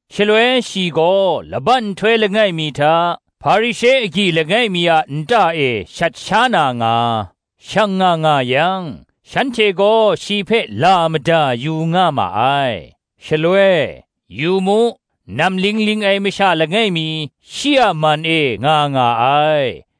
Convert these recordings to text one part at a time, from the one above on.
Shaloi shi gaw laban nhtoi langai mi hta, Hparishe agyi langai mi a nta e shat sha na nga, shang nga nga yang, shanhte gaw shi hpe la mada yu nga ma ai. Shaloi, yu mu, namling ling ai masha langai mi, shi a man e nga nga ai.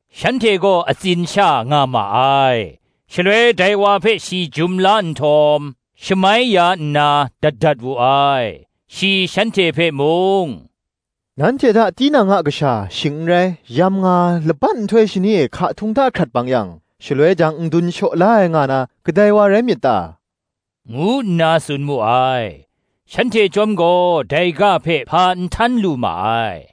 Shanhte gaw atsin sha nga ma ai. Shaloi dai wa hpe shi jum la nhtawm, shamai ya nna, dat dat wu ai. Shi shanhte hpe mung, “Nanhte hta tinang a kasha, shing n rai, yamnga, laban nhtoi shani e hka htung hta hkrat bang yang, shaloi jang n dun shaw la ai nga na, kadai wa rai myit ta?” ngu nna tsun mu ai. Shanhte chyawm gaw dai ga hpe hpa n htan lu ma ai.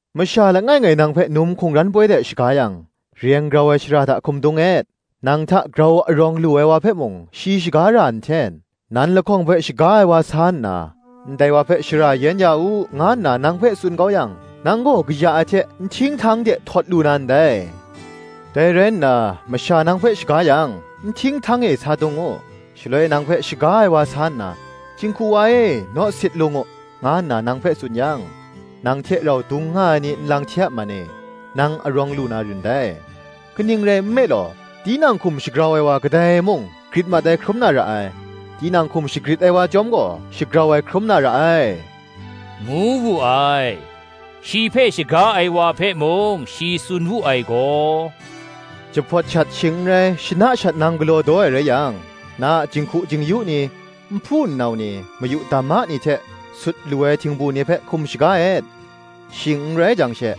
“Masha langai ngai nang hpe num hkungran poi de shaga yang, reng grau ai shara hta hkum dung et: nang hta grau arawng lu ai wa hpe mung shi shaga ra nhten; nan lahkawng hpe shaga ai wa sa nna, ‘Ndai wa hpe shara yen ya u,’ nga nna nang hpe tsun kau yang, nang gaw kaya ai hte nhting htang de htawt lu na ndai. Dai rai nna, masha nang hpe shaga yang, nhting htang e sa dung u: shaloi nang hpe shaga ai wa sa nna, ‘Jinghku wa e, naw sit lung u,’ nga nna nang hpe tsun yang, nang hte rau dung nga ai ni nlang hte a man e, nang arawng lu na rin dai. Kaning rai nme law, tinang hkum shagrau ai wa kadai mung, grit mat ai hkrum na ra ai: tinang hkum shagrit ai wa chyawm gaw, shagrau ai hkrum na ra ai,” ngu wu ai. Shi hpe shaga ai wa hpe mung shi tsun wu ai gaw, “Jahpawt shat, shing n rai, shana shat nang galaw daw ai rai yang, na a jinghku jing-yu ni, nhpu nnau ni, mayu dama ni hte sut lu ai htingbu ni hpe hkum shaga et: shing n rai jang she,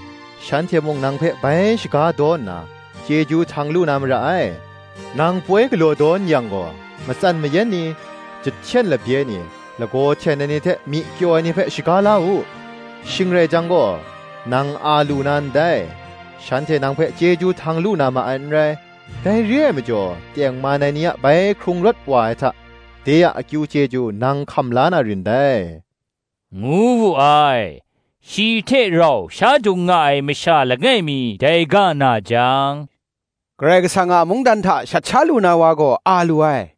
shanhte mung nang hpe bai shaga daw nna, chyeju htang lu na mara ai. Nang poi galaw daw n-yang gaw, matsan mayan ni, jahten labye ni, lagaw hten ai ni hte myi kyaw ai ni hpe shaga la u: shing rai jang gaw, nang a lu na ndai: shanhte nang hpe chyeju htang lu na ma ai n rai: dai re ai majaw, tengman ai ni a bai hkrung rawt wa ai hta, de a akyu chyeju nang hkam la na rin dai,” ngu wu ai. Shi hte rau sha dung nga ai masha langai mi dai ga na jang, “Karai Kasang a mungdan hta shat sha lu na wa gaw a lu ai,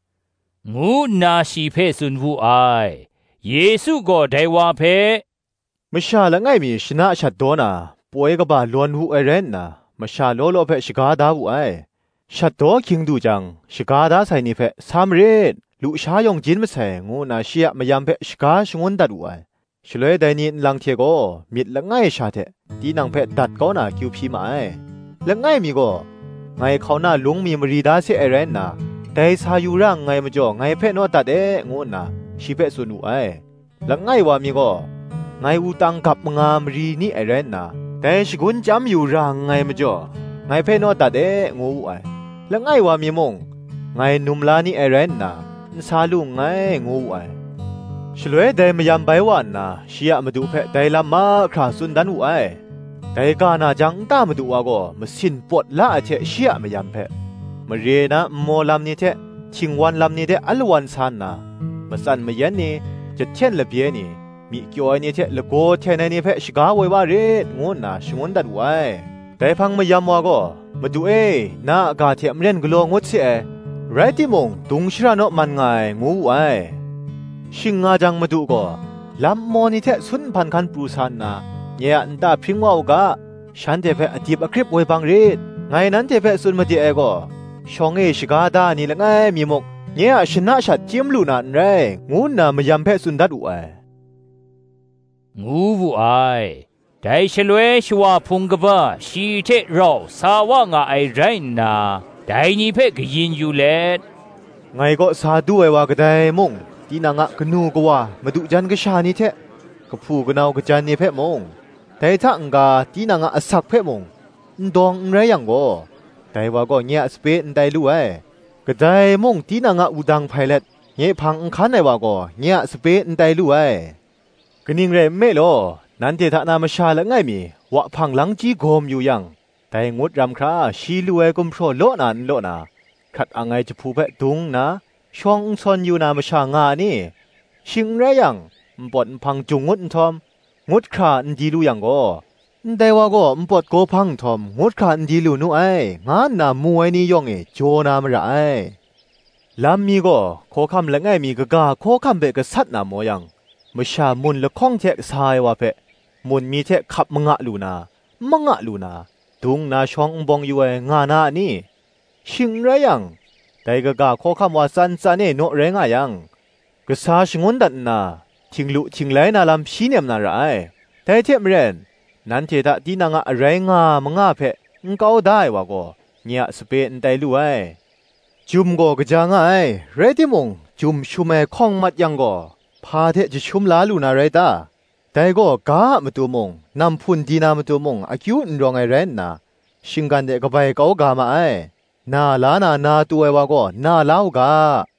ngu nna shi hpe tsun wu ai. Yesu gaw dai wa hpe, Masha langai mi shana shat daw na poi kaba lawn wu ai rai nna, masha law law hpe shaga da wu ai: shat daw hkying du jang, shaga da sai ni hpe, ‘Sa marit, lusha yawng jin masai,’ ngu nna shi a mayam hpe shaga shangun dat wu ai. Shaloi dai ni nlang hte gaw, myit langai sha hte tinang hpe dat kau na hku hpyi ma ai. Langai mi gaw, ‘Ngai hkauna lung mi mari da se ai rai nna, dai sa yu ra nngai majaw, ngai hpe naw dat e,’ ngu nna shi hpe tsun wu ai. Langai wa mi gaw, ‘Ngai wutang gap manga mari ni ai rai nna, dai shagun chyam yu ra nngai majaw, ngai hpe naw dat e,’ ngu wu ai. Langai wa mi mung, ‘Ngai num la ni ai rai nna, n sa lu nngai,’ ngu wu ai. Shaloi dai mayam bai wa nna shi a Madu hpe dai lam mahkra tsun dan wu ai. Dai ga na jang nta madu wa gaw masin pawt la ai hte shi a mayam hpe, ‘Mare na nmaw lam ni hte htingwan lam ni de alawan sa nna, matsan mayan ni, jahten labye ni, myi kyaw ai ni hte lagaw hten ai ni hpe shaga woi wa rit,’ ngu nna shangun dat wu ai. Dai hpang mayam wa gaw, ‘Madu e, na a ga hte maren galaw ngut se ai; rai timung, dung shara naw man nga ai,’ ngu wu ai. Shing nga jang madu gaw, ‘Lam nmaw ni hte sun nhpan hkan pru sa nna, nye a nta hpring wa u ga, shanhte hpe adip akrip woi bang rit: ngai nanhte hpe tsun made ai gaw, Shawng e shaga da ai ni langai mi muk, nye a shana shat chyim lu na n rai, ngu nna mayam hpe tsun dat wu ai,” ngu wu ai. Dai shaloi shawa hpung kaba shi hte rau sa wa nga ai rai nna, dai ni hpe kayin yu let, “Ngai kaw sa du ai wa kadai mung, tinang a kanu kawa, madu jan kasha ni hte, kahpu kanau kajan ni hpe mung, dai hta n ga tinang a asak hpe mung, n dawng n rai yang gaw, dai wa gaw nye a sape n tai lu ai. Kadai mung tinang a wudang hpai let nye hpang n hkan ai wa gaw, nye a sape n tai lu ai. Kaning rai nme law, nanhte hta na masha langai mi, wahpang langchyi gaw mayu yang, dai ngut ram hkra shi lu ai gumhpraw law na n law na, hkrat ang ai jahpu hpe dung nna, shawng n sawn yu na masha nga a ni? Shing n rai yang, npawt nhpang jung ngut nhtawm, ngut hkra n di lu yang gaw, ‘Ndai wa gaw npawt gaw hpang nhtawm ngut hkra n di lu nu ai,’ nga nna mu ai ni yawng e jaw na mara ai. Lam mi gaw, hkawhkam langai mi kaga hkawhkam hpe gasat na maw yang, masha mun lahkawng hte sa ai wa hpe, mun mi hte hkap manga lu na, n manga lu na, dung nna shawng n bawng yu ai, nga na a ni? Shing n rai yang, dai kaga hkawhkam wa tsan tsan e naw rai nga yang, kasa shangun dat nna, htinglu htinglai na lam hpyi nem na ra ai. Dai hte maren, nanhte hta tinang a arai nga manga hpe n kau da ai wa gaw, nye a sape n tai lu ai. Jum gaw kaja nga ai; rai timung, jum shum ai hkawng mat yang gaw, hpa hte jashum la lu na rai ta? Dai gaw ga a matu mung, namhpun di na matu mung, akyu n rawng ai rai nna, shinggan de kabai kau ga ma ai. Na la na, na tu ai wa gaw, na la u ga”